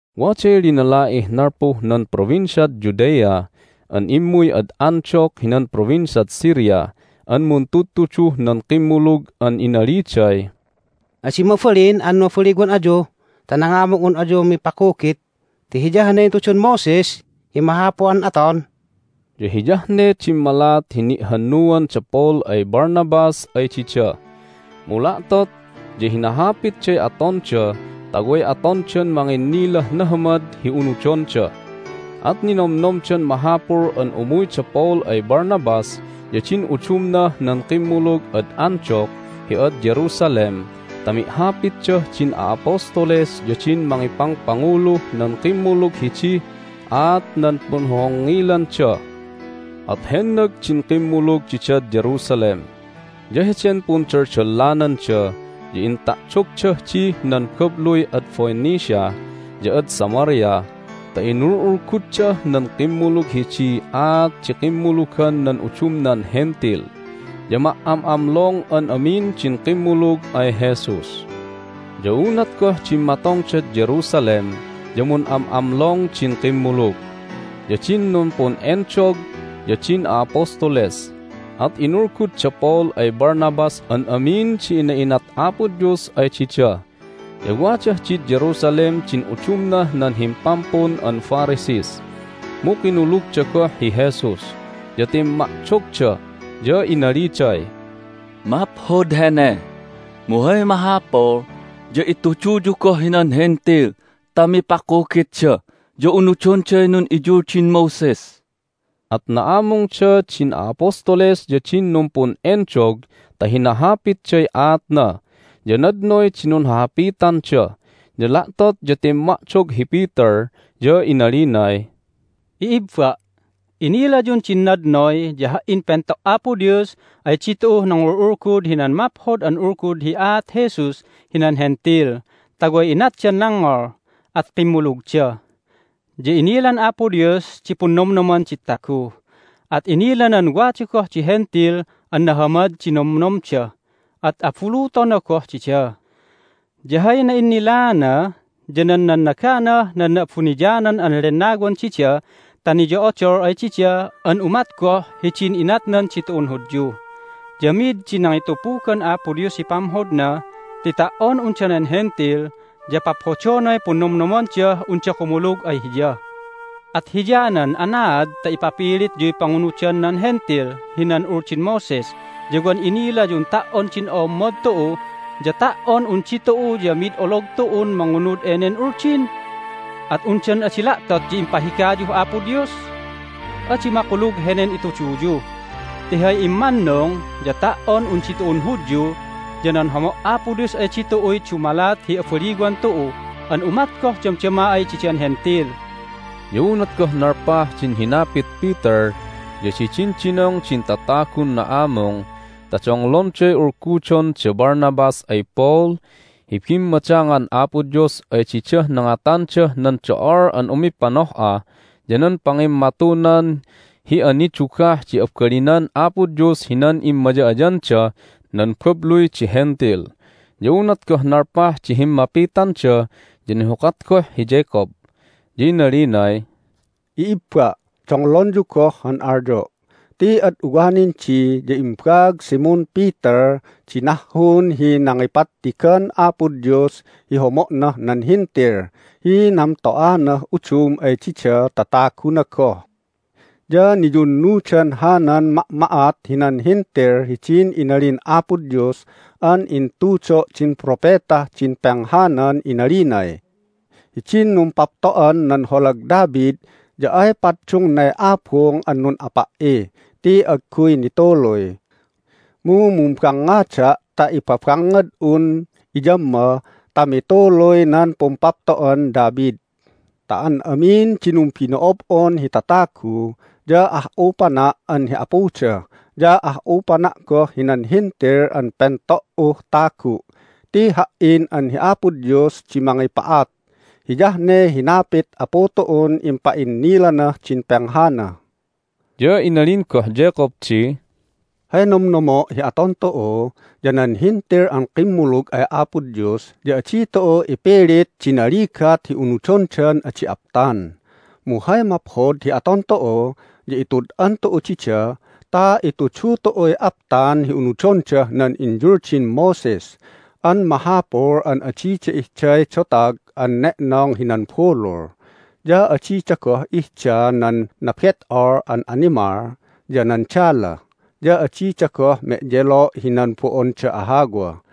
Waday linala'ih nalpuh nan Provinciad Judea an immuy ad Antioch hinan Provinciad Syria an muntudtuduh nan kimmulug an inaliday, "Adi mabalin an mabaliwan ayu ta nangamung un ayu mipakugit ti hiyah ne intudun Moses hi mahapul an aton." Ya hiyah ne dimmalat hi ni'hannuan da Paul ay Barnabas ay dida. Mu la'tot ya hinahapitday atonda ta way atondan manginnilah nahamad hi unudonda. At ninomnomdan mahapul an umuy da Paul ay Barnabas ya din udumnah nan kimmulug ad Antioch hi ad Jerusalem ta mi'hapitdah din a'apostoles ya din mangipangpanguluh nan kimmulug hidih aat nan punhohongngilanda. At hennag din kimmulug didad Jerusalem, ya heden pundaldalananda ya inta'dogdah dih nan babluy ad Phoenicia ya ad Samaria ta inul'ulguddah nan kimmulug hidiy aat di kimmulugan nan udumnan Hentil. Ya ma"am'amlong an amin din kimmulug ay Jesus. Ya unat goh dimmatongdad Jerusalem ya mun'am'amlong din kimmulug, ya din numpun'endog, ya din a'apostoles. At inulgud da Paul ay Barnabas an amin di ina'inat Apo Dios ay dida. Ya wadah did Jerusalem din udumnah nan himpampun an Pharisees (mu kinulugda goh hi Jesus), ya timma'dogda, ya inaliday, "Maphod hene! Mu hay mahapul ya ituduyu goh hinan Hentil ta mipakugitda ya unudonday nun'iyuldin Moses!" At na'amungda din a'apostoles ya din numpun'endog ta hinahapitday aatna, ya nadnoy di nunhahapitanda. Ya la'tot ya timma'dog hi Peter, ya inalinay, "I'ibba', inilayun din nadnoy ya ha"in pento' Apo Dios ay ditu'uh nangul'ulgud hinan Maphod an Ulgud hi aat Jesus hinan Hentil ta way inatdan nangngol, at kimmulugda. Ya inilan Apo Dios di punnomnoman di tagu, at inilanan wada goh di Hentil an nahamad di nomnomda, at abulutona goh dida. Ya hay na'innilaana ya nan nannaganah nan Na'abuniyanan an Lennawan dida ta niyo'odol ay dida an umat goh hidin inatnan ditu'un Hudyu. Ya mid di nangitupugan Apo Dios hi pamhodna ti ta"on un danen Hentil ya paphodonay punnomnomandah unda kumulug ay Hiya. At hiyanan anaad ta ipapilityuy pangunudan nan Hentil hinan Uldin Moses ya wan inilayun ta"on din o'ommod tu'u ya ta"on un ditu'u ya mid olog tu'un mangunud enen Uldin? At undan adi la'tot ya impahigayuh Apo Dios? Adi makulug henen ituduyu, ti hay immannung ya ta"on un ditu'un Hudyu ya nan homo' Apo Dios ay ditu'uy dumalat hi abaliwan tu'u an umat goh damdama ay didan Hentil." Ya unat goh nalpah din hinapit Peter ya didindinong din tatagun na'amung ta donglonday ulgudon da Barnabas ay Paul hi bimmadangan Apo Dios ay didah nangatandah nan do'ol an umipanoh'a ya nan pangimmatunan hi anidugah di abalinan Apo Dios hinan immaya'ayandah nan babluy di Hentil. Ya unat goh nalpah di himmapitanda ya nihukat goh hi Jacob, ya inalinay, "I'ibba', donglonyu goh han alyo'! Ti ad uwanindi ya imbaag Simon Peter di nahhun hi nangipattigan Apo Dios hi homo'nah nan Hentil hi namto'anah udum ay dida ta taguna goh. Ya niyunnudan hanan ma'ma'at hinan Hentil hidin inalin Apo Dios an intudo' din propetah din penghanan inalinay, Hidin numpapto'an nan holag David ya ay paddungnay abung an nun'apa"i ti agguy nituluy. Mu mumbangngada' ta ipabangngad'un iyamma ta mituluy nan pumpapto'an David. Ta an amin di numbino'ob'on hi tatagu ya ah'upana' an hi Apuda, ya ah'upana' goh hinan Hentil an pento"uh tagu' ti Ha"in an hi Apo Dios di mangipa'at. Hiyah ne hinapit Apu tu'un impa'innilanah din penghana." Ya inalin goh Jacob di, "Hay nomnomo' hi aton tu'u ya nan Hentil an kimmulug ay Apo Dios ya adi tu'u ipilit di naligat hi unudondan adi aptan. Mu hay maphod hi aton tu'u ya itud'an tu'u dida ta itudu tu'uy aptan hi unudondah nan inyuldin Moses an mahapul an adida ihday dotag an ne'nong hinan bulul, ya adida goh ihda nan nabet'ol an animal, ya nan dala. Ya adida goh me'yelo' hinan bo'onda ahawa.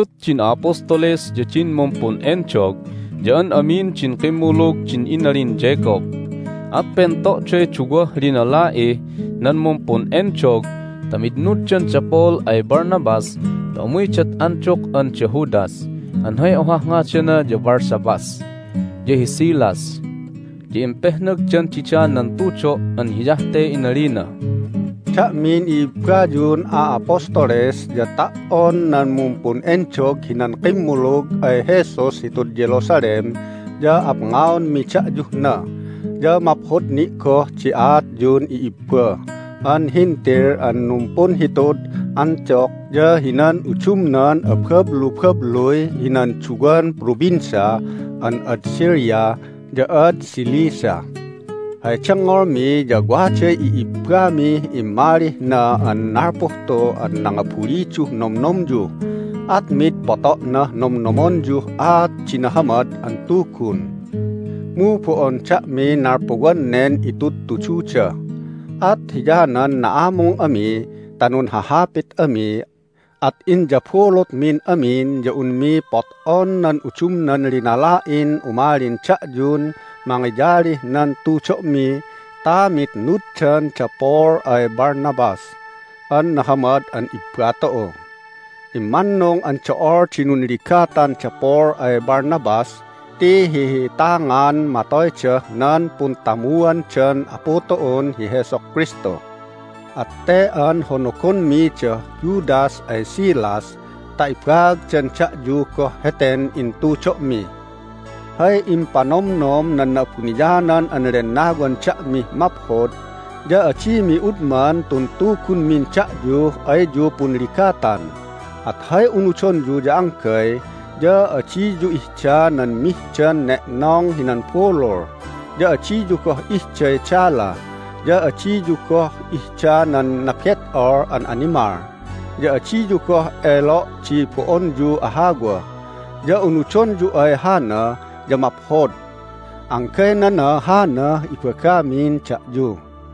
Inabulut din a'apostoles, ya din mumpun'endog, ya an amin din kimmulug din inalin Jacob. At pento'day duwah linala'ih nan mumpun'endog ta mitnuddan da Paul ay Barnabas ta umuydad Antioch an da Judas (an hay ohah ngadana ya Barsabbas) ya hi Silas. Ya impehnagdan dida nan tudo' an hiyah te inalina: "Da'min i'ibbayun a'apostoles ya ta"on nan mumpun'endog hinan kimmulug ay Jesus hitud Jerusalem ya apngaonmi da'yuh na, ya maphod ni' goh di aatyun i'ibba an Hentil an numpunhitud Antioch ya hinan udumnan abablubabluy hinan duwan provincia an ad Syria ya ad Cilicia. Hay dengngolmi ya waday i'ibbamih immalih na an nalpuh tu an nangabuliduh nomnomyu, at mid poto'nah nomnomonyuh aat di Nahamad an Tugun. Mu bo'on da'miy nalpuwan nen itudtududa. At hiyanan na'amung ami ta nunhahapit ami, at inyabulutmin amin ya unmi pot'on nan udumnan linala'in umalin da'yun mangiyalih nan tudo'mi ta mitnuddan da Paul ay Barnabas an nahamad an ibba tu'u. Immannung an do'ol di nunligatan da Paul ay Barnabas ti hi'ihi'itangan matoydah nan puntamuandan Apu tu'un hi Jesu Kristu! At te an honogonmi da Judas ay Silas ta ibaagdan da'yu goh heten intudo'mi. Hay impanomnom nan Na'abuniyanan an Lennawan da'mih maphod ya adimi udman tun tugunmin da'yuh ayyu punligatan, at hay unudonyu ya anggay ya: adiyu ihda nan mihdan ne'nong hinan bulul, ya adiyu goh ihday dala, ya adiyu goh ihda nan nabet'ol an animal, ya adiyu goh elo' di bo'onyu ahawa. Ya unudonyu ay hana ya maphod. Anggaynana hanah ibagamin da'yu."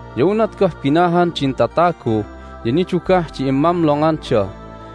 Ya unat goh binahan din tatagu ya nidugah di immamlonganda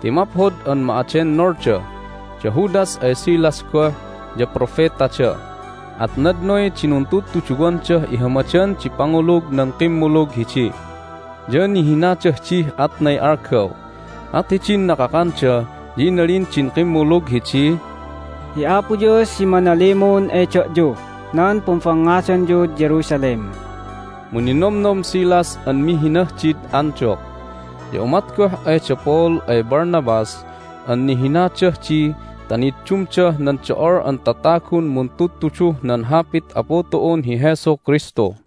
ti maphod an ma'adennolda. Da Judas ay Silas goh ya propetada, at nadnoy di nuntudtuduwandah ihamadan di pangulug nan kimmulug hidi. Ya nihinadah dih atnay algaw. At hidin nakakanda ya inalin din kimmulug hidiy, "Hi Apo Dios di manalimun ay da'yuh nan pumbangngadanyud Jerusalem!" Mu ninomnom Silas an mihinah did Antioch. Ya umat goh ay da Paul ay Barnabas an nihinadah di ta niddumdah nan do'ol an tatagun muntudtuduh nan Hapit Apu tu'un hi Jesu Kristu.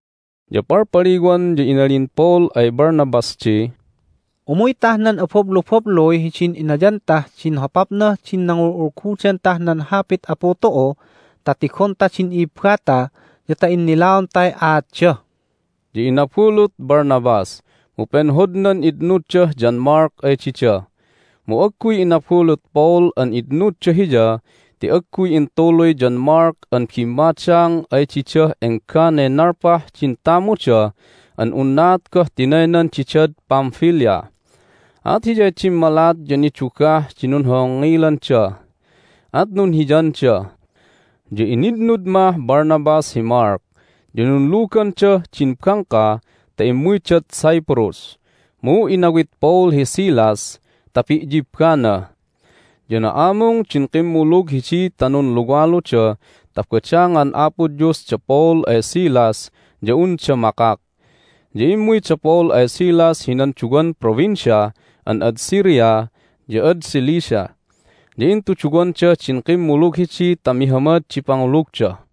Ya palpaliwan ya inalin Paul ay Barnabas di, "Umuytah nan abablubabluy hidin inayantah din hopapnah din nangul'ulgudantah nan Hapit Apu tu'u ta tigonta din i'ibbata ya ta innilaontay aatda." Ya inabulut Barnabas, mu penhodnan itnuddah John Mark ay dida, mu agguy inabulut Paul an itnudda hiya ti agguy intuluy John Mark an bimmadang ay didah engganay nalpah din tamuda an unnaat goh tinaynan didad Pamphylia! At hiyay dimmalat ya nidugah di nunhongngilanda, at nunhiyanda. Ya initnud mah Barnabas hi Mark, ya nunlugandah din bangka ta immuydad Cyprus. Mu inawit Paul hi Silas ta pi'yibbana. Ya na'amung din kimmulug hidi ta nunluwaluda ta badangan Apo Dios da Paul ay Silas ya unda makak. Ya immuy da Paul ay Silas hinan duwan provincia an ad Syria ya ad Cilicia, ya intuduwanda din kimmulug hidi ta mihamad di pangulugda.